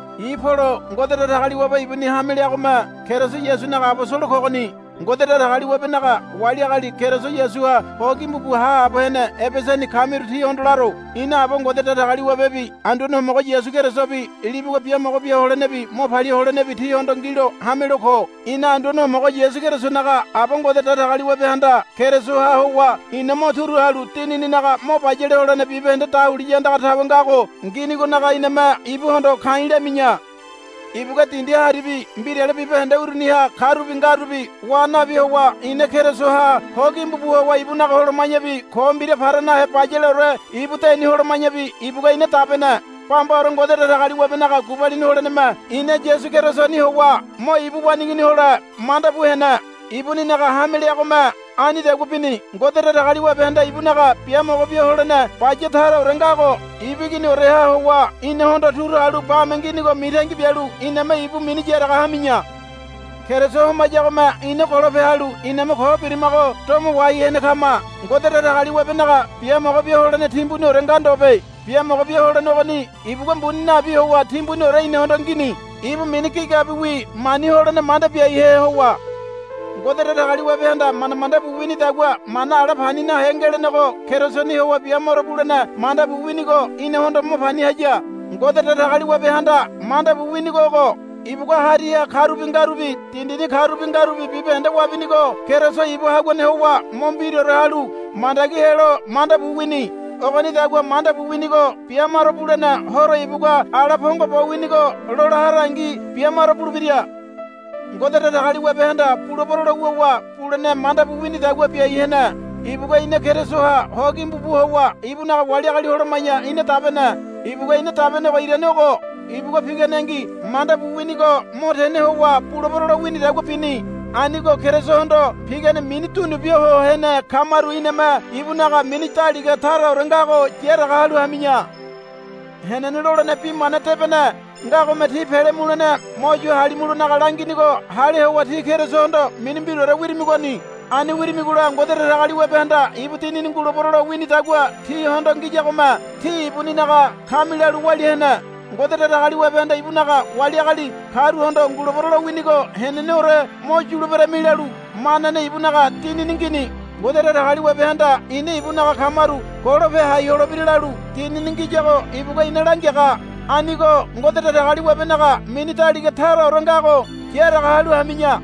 I̱ Polo. Ngode Datagaliwabe ibuni hame leagome Keriso Yasunaga abosolo kogoni. Ngode Datagaliwabenaga wali agali Keriso Yasuha ho gimbu bu haabo hene Ebesani kamiru tíhondo laro. Ina Aba Ngode Datagaliwabebi Anduane Homogo Yasu Kerisobi libugua biamogo bia holenebi mo palia holenebi tíhondo ngilo hamelo ko. Ina Anduane Homogo Yasu Kerisonaga Aba Ngode Datagaliwabehanda Kerisoha howa ina mo turu halu dinininaga mo bayale holene bibahende dahuliya andaga tawe ngago nginigonaga iname ibuhondo ka̱i̱ lami̱ya. Ibugua dindi haribi mbirale bibahende uruniha karubi ngarubi wa nabi howa ina Kerisoha ho gimbu bu howa ibunaga holoma̱yabi ko mbira para nahe bayaleore ibu deni holoma̱yabi ibugua ina dabene. Bambaore Ngode Datagaliwabenaga gubalini holeneme ina Yasu Kerisoni howa mo ibu waneigini hole manda bu hene. Ibuninaga hame leagome anidagua bini. Ngode Datagaliwabehanda ibunaga biamogo bia holene baya taraore ngago ibu Iginioreha howa inahondo turu halu bame nginigo mitangi bialu iname ibu mini yaraga hami̱ya. Keriso homayagome ina golope halu iname ko birimago domo wahai hene kama. Ngode Datagaliwabenaga biamogo bia holene timbuniore nga ndobe. Biamogo bia holene ogoni ibugua mbuni nabi howa timbuniore inahondo ngini. Ibu mini gigabiwi mani holene manda biahe howa Ngode Datagaliwabehanda manda manda bu winidagua mana ala pani nahe ngelenego Kerisoni howa bia maro bulene manda bu winigo inahondo mo pani haya. Ngode Datagaliwabehanda manda bu winigo ogo. Ibugua hariha karubi ngarubi dindini karubi ngarubi bibahende wabinigo Keriso ibu haguane howa mo mbiraore halu mandagi helo manda bu wini. Ogonidagua manda bu winigo bia maro bulene horo ibugua ala pongo bo winigo lola harangi bia maro bulebira. Ngode Datagaliwabehanda bulebero lo wuwa bulene manda bu winidagua biai hene. Ibugua ina Kerisoha ho gimbu bu howa ibunaga wali agali holoma̱ya ina dabene. Ibugua ina dabenego irane ogo. Ibugua piganengi manda bu winigo mo tene howa bulebero lo winidagua bini. Anigo Kerisohondo pigane mini dunu bia ho hene kamaru iname ibunaga mini daliga taraore ngago yaraga halu hami̱ya. Henene lolene Bi Mana Debene ngagome tí pele mulene mo yu halimulonaga langinigo hale howa tí Kerisohondo mini mbiraore wirimigoni. Ani wirimigola Ngode Datagaliwabehanda ibu Dinini ngulebero lo winidagua tíhondo ngiyagome tí ibuninaga kami lalu walia hene. Ngode Datagaliwabehanda ibunaga wali agali karuhondo ngulebero lowinigo heneneore mo yuleberami lalu manane ibunaga Dinini ngini. Ngode Datagaliwabehanda ina ibunaga kamaru golope hai holebira lalu Dinini ngiyago ibugua ina langiaga. Anigo Ngode Datagaliwabenaga mini daliga taraore ngago yaraga halu hami̱ya.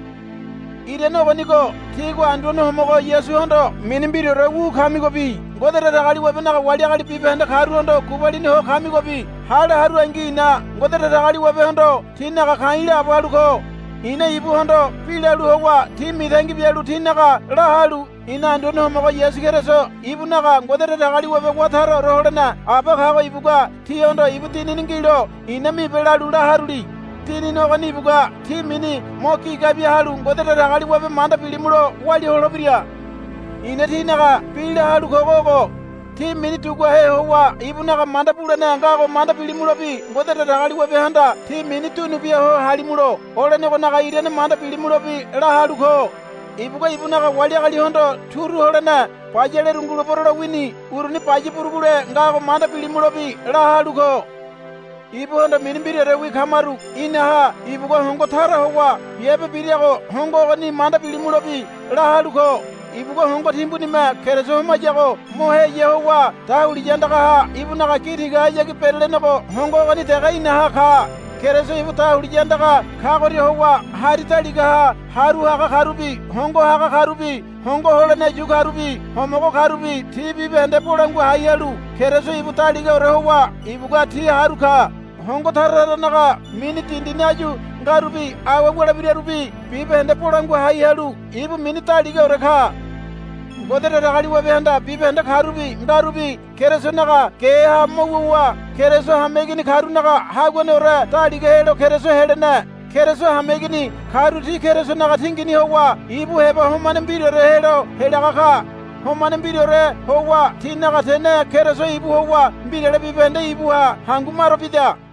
Irane ogonigo tígua Anduane Homogo Yasuhondo mini mbiraore wu kamigobi Ngode Datagaliwabenaga wali agali bibahende karuhondo gubalini ho kamigobi hale harungi i̱na Ngode Datagaliwabehondo tínaga ka̱i̱ laabo halu ko. I̱na ibuhondo bi lalu howa tí mitangi bialu tínaga la halu ina Anduane Homogo Yasu Keriso ibunaga Ngode Datagaliwabe wá taraore holene Aba kago ibugua tíhondo ibu Dinini ngilo i̱na mibe lalu la haruli. Dinini ogoni ibugua tí mini mo gigabi halu Ngode Datagaliwabe manda bilimulo walia holebira. I̱na tínaga bi la halu kogo ogo. Tí mini duguahe howa ibunaga manda bulene ngago manda bilimulobi Ngode Datagaliwabehanda tí mini dunu bia ho halimulo olenegonaga irane manda bilimulobi la halu ko. Ibugua ibunaga wali agalihondo turu holene bayaleru ngulebero lowini uruni baya burugule ngago manda bilimulobi la halu ko. Ibuhondo mini mbiraorewi kamaru inaha ibugua hongo tara howa biabe birago hongo ogoni manda bilimulobi la halu ko. Ibugua hongo timbunime Keriso homayago mo heya howa dahuliya andagaha ibunaga gi tigahayagi berelenego hongo ogoni dege inaha ka. Keriso ibu dahuliya andaga kagoria howa hari daligaha haru haga karubi hondo haga karubi hongo holene yu karubi homogo karubi ti bibahende bolangua hai halu Keriso ibu daligaore howa ibugua ti haru ka. Hongo tara taranaga mini dindini áyu ngarubi awe wulebirarubi bibahende bolangua hai halu ibu mini daligaore ka. Ngode Datagaliwabehanda bibahende karubi ngarubi Kerisonaga geha mo wuwa Keriso hameigini karunaga Haguaneore daliga helo Keriso helene. Keriso hameigini karu ti Kerisonaga tingini howa ibu heba homane mbiraore helo helaga ka. Homane mbiraore howa tinaga tene Keriso ibu howa mbirale bibahende ibuha hangu maro bida.